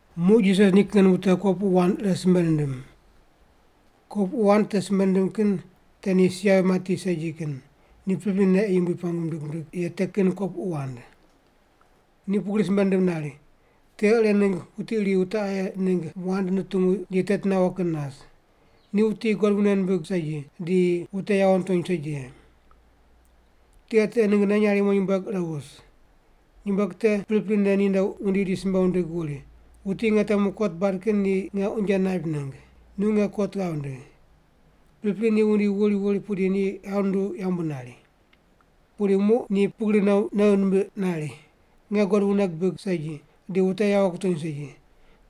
Muq Jisas nikin wute kopuqu wand ire simbe nindim. Kopuqu wand te simbe nindim kin te ni si yavi mati segi kin, ni priprine ei Yumbui pengu mindig ye te kin kopuqu wand. Ni pugri simbe nindim nari, “Tiqe ire ningg wuti iri wute aye ningg wand nutungu di teti nawo kin nas. Ni wuti God wune nimbig segi, di wute yawo nitony segi ye. Tiqe te ninggne nyarimo nyumbueg ire wus. Nyumbueg te priprine ninde wundi di simbe wundig wuri, ‘Wuti nge temu kot bad kin ni nge unje naip ningg. Nu nge kot ghav ndigh.’ “Pripri ni wundi wuri pudi ni ghav nunduw yambu nari. Pudi muq ni pugri nei nimbiq nari, ‘Nge God wune gibig segi, di wute yawo kutony segi,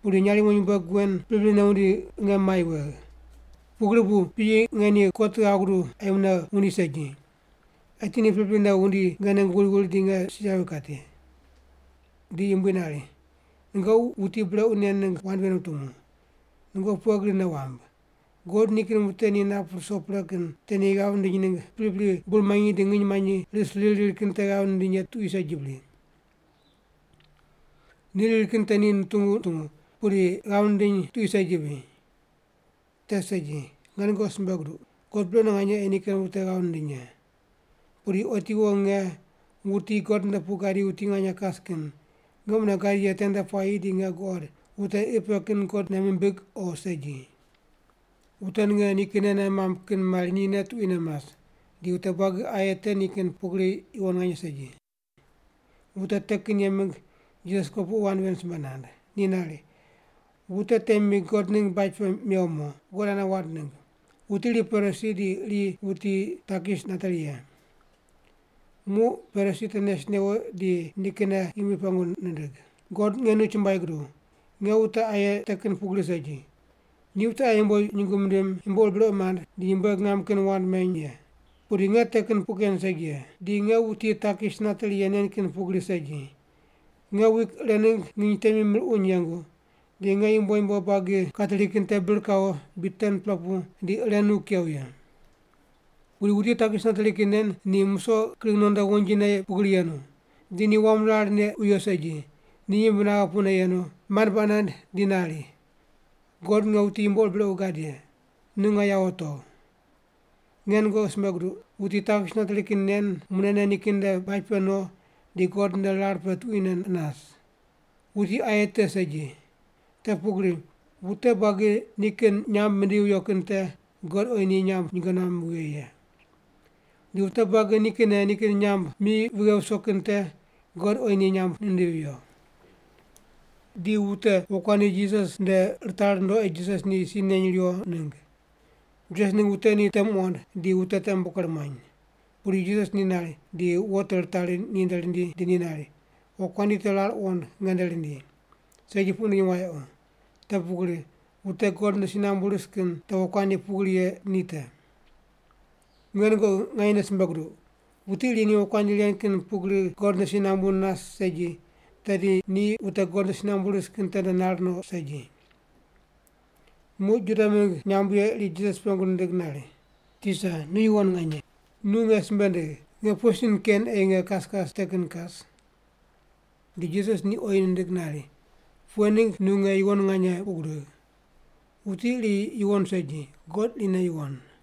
pudi nyarimo nyumbueg wen priprine wundi nge mai wegh. Pugri bu piyi nge ni kot ghav guduw ei mune wundi segi. Eti ni priprine wundi nge ningg wuri wuri di nge si yavi kati’.” Di Yumbui nari, “Nungoqi wuti brequ nen ningg wand ven wutungu. Nungoqi pughe gri nei wamb? God nikin wute ni nap ruso pre kin te ni ghav nindiny ningg pripri bur manyi di nginy manyi ris riri riri kin te ghav nindiny ye tuqui segi bri? Ni riri kin te ni nutungu nutungu, pudi ghav nindiny tuqui segi bri? Te segi. Nge nungoqi simbe guduq, God brequne nganye ei nikin wute ghav nindiny ye. Pudi otiwo nge, wuti God nde pu gadi wuti nganye kas kin, nge mune gadi ye tende puayi di nge guqod wute qi pe kin God nei mimbig o segi?” Wute ninge nikinne nei mamb kin mari nine tuquine mas, di wute buagi aye te ni kin pugri yuwon nganye segi. Wute te kin ye mingg Jisas kopuqu wand ven simbe nand. Ni nari, “Wute temi God ningg baj pe mewo mo, God ane wand ningg. Wuti iri Parisi di iri wuti takis nateri ye. Muq Parisi te nes newo di nikinne Yumbui pengu nindig, ‘God nge nu chumbuai guduw, nge wute aye te kin pugri segi. Ni wute aye yumbo nyungu mindim, yumbo ur brequ mand, di nyumbueg ngam kin wand meny ye. Pudi nge te kin puq ken segi ye. Di nge wuti takis nateri ye nen kin pugri segi. Nge wik ire ningg nginy temi mir uny yengu, di nge yumbo yumbo buagi kateri kin te bir kawo bid 10-pela pu di ire nu kew ye.’ “Pudi wuti takis nateri kin ni musoq kring nondo wonjine pugri yenu. Di ni wam rar neq wiyo segi, ni yimbne naghe pu yenu, mand baq nand di nari, ‘God nge wuti yumbo ur brequ gad ye, nu nge yawo togh.’ “Nge nungoqi simbe guduq, wuti takis nateri kin nen munene nikin nde baj pe no di God nde rar pe tuquine nas. Wuti aye te segi. Te pugri wute buagi nikinne nikin nyamb mindivi viyo kin te God oyi ni nyamb nyinge nuam vighe ye. Di wute buagi nikinne nikin nyamb mi vighe viso kin te God oyi ni nyamb nindivi viyo.” Di wute wokuandi Jisas nde ritari rundo ei Jisas ni si neny riwo ningg. Jisas ningg wute ni te muqond, di wute te ker muany. Pudi Jisas ni nari di wo te ritari ni nde rindi di ni nari, “Wokuandi te rar wuqond nge nde rindi, segi puq wundiny wayequ, te pugri wute God nde si nambu ris kin te wokuandi pugri ye ni te. Nge nungoqi nganye simbe guduq, wuti iri ni wokuandi ren kin pugri God nde si nambu nas segi, tedi ni wute God nde si nambu ris kin tende nar no segi.” Muq Juda mingg nyamb ye iri Jisas pengu nindig nari, “Tisa, nu yuwon nganye. Nu nge simbe ndigh, nge pughe sin ken ei nge kas kas te kin kas?” Di Jisas ni oyi nindig nari, “Pughe ningg nu nge yuwon puq gudigh? Wuti iri yuwon segi; God irine yuwon.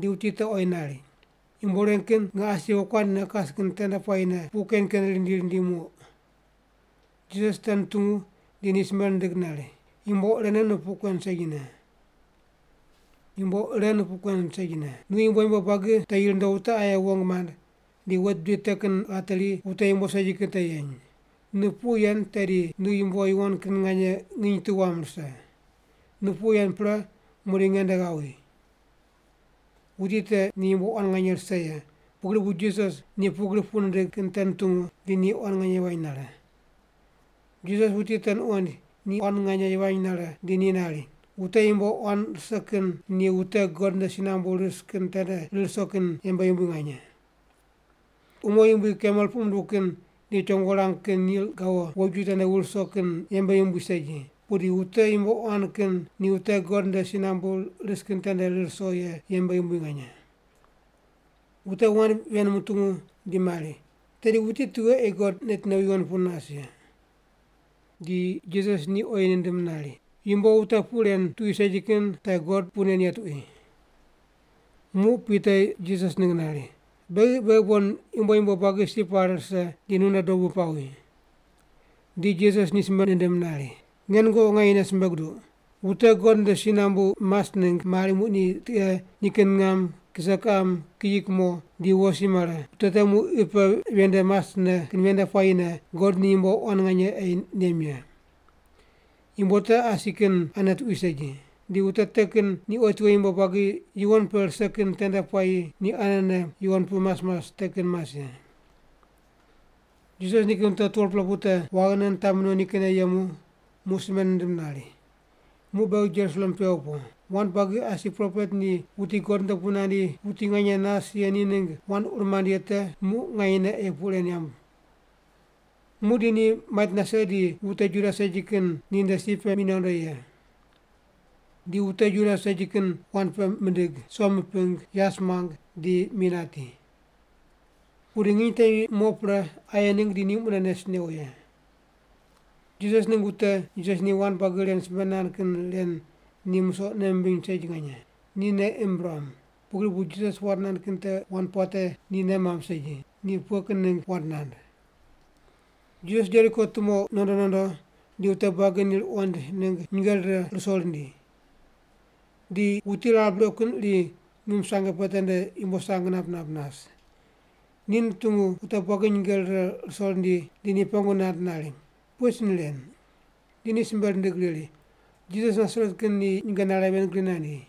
Di wuti te oyi nari, “Yumbo ren kin nge asi wokuandi ne kas kin tende puayine puq ken ken rindi rindi muq.” Jisas te nutungu di ni simbe nindig nari, “Yumbo ire nu puq kuen segine. Nu yumbo yumbo buagi te yi rundo wute aye wong mand, di wet bidi te kin ghateri wute yumbo segi kin yeny. Nu puq yen tedi nu yumbo yuwon kin nganye nginy tu wam rise. Nu puq yen pre muqdi nge nde ghawi.” Wuti te ni yumbo quan nganye rise ye, pugri bu Jisas ni pugri puq nindig kin te nutungu di ni quan nganye yivany nare. Jisas wuti te nuqoind ni quan nganye yivany nare, di ni nari, “Wute yumbo quan rise kin ni wute God nde si nambu ris kin tende rir ruso kin yembe yumbui nganye. Umo yumbui kamel puq munduw kin ni chongo rang kin nil gawo woju tende wur wuso kin yembe yumbui segi, pudi wute yumbo quan kin ni wute God nde si nambu ris kin tende rir ruso ye yembe yumbui nganye.” Wute wand ven mutungu di mari, “Tedi wuti tughe ei God neti nowi yuwon pu nas ye?” Di Jisas ni oyi nindim nari, “Yumbo wute puq ren tuqui segi kin te God puq nen ye tuqui.” Muq Pita Jisas ningg nari, “Beghi beghi bon yumbo yumbo buagi si pare rise di nu nde dobu pawi.” Di Jisas ni simbe nindim nari, “Nge nungoqi nganyene simbe guduq, wute God nde si nambu mas ningg mari muq ni tiqe, nikin ngam, kise kiqam, kiyi kumo, di wo si mare, wute te muq qi pe ven nde masne kin ven nde puayine God ni yumbo quan nganye ei nem ye. Yumbo te asi kin ane tuqui segi. Di wute te kin ni otiwo yumbo buagi yuwon pe rise kin tende puayi ni anene yuwon pu mas mas te kin mas ye.” Jisas nikin wute 12-pela pu te waghine nitami no nikinne yemu, muq simbe nindim nari, “Muq beghi Jerusalem pewo po. Wand buagi asi propet ni wuti God nde pu nandi wuti nganye nas ye ni ningg wand ur mand ye te muq nganyene ei puq ren yamb. Muqdi ni mait nase di wute Juda segi kin ninde si pe mi nondo ye. Di wute Juda segi kin wand peq mindig, som miping, yas muang, di mi nati. Pudi nginy temi mo pre aye ningg di ni mune nes newo ye.” Jisas ningg wute Jisas ni wand buagi ren simbe nand kin ren ni musoq nei mimbiny segi nganye. Ni nei imb ruam, pugri bu Jisas wand nand kin te wand puate ni nei mamb segi, ni pughe kin ningg wand nand. Jisas Jeriko tumo nondo nondo di wute buagi ni ruqoind ningg nyinge rire ruso rindi. Di wuti rar brequ kin iri ngim sange pe tende yumbo sang nap nap nas. Ni nutungu wute buagi nyinge rire ruso rindi di ni pengu nand nari, “Pughe sin ren?” Di ni simbe rindig riri, “Jisas Nasaret kin ni nyinge nare ven gri nandi.”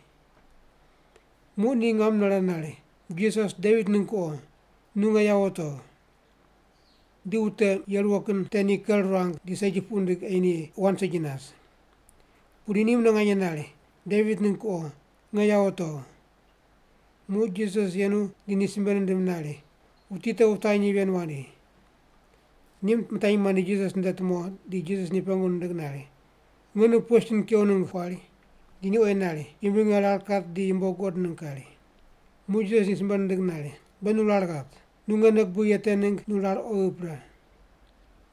Muq ni ngam nare nari, “Jisas, Devit ningg kuqo, nu nge yawo togh.” Di wute ye ruwo kin te ni ker ruang di segi puq rindig ei ni wand segi nas. Pudi ni mune nganye nari, “Devit ningg kuqo, nge yawo togh.” Muq Jisas yenu di ni simbe nindim nari, “Wuti te wutanyi ven wandi.” Ni mitanyi mandi Jisas nde tumo di Jisas ni pengu nindig nari, “Nge nu pughe sin kew ningg kuari?” Di ni oyi nari, “Yumbui, nge rar kat di yumbo guqod ningg kari.” Muq Jisas ni simbe nindig nari, “Be nu rar ghat. Nu nge nei gubigh ye te ningg nu rar oghi pre.”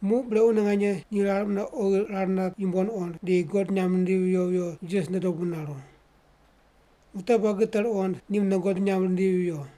Muq brequne nganye ni rar mune oghi rar nat yumbo nuqond, di God nyamb nindivi viyo viyo Jisas nde dobu naru. Wute buagi te ruqond, ni mune God nyamb rindivi viyo.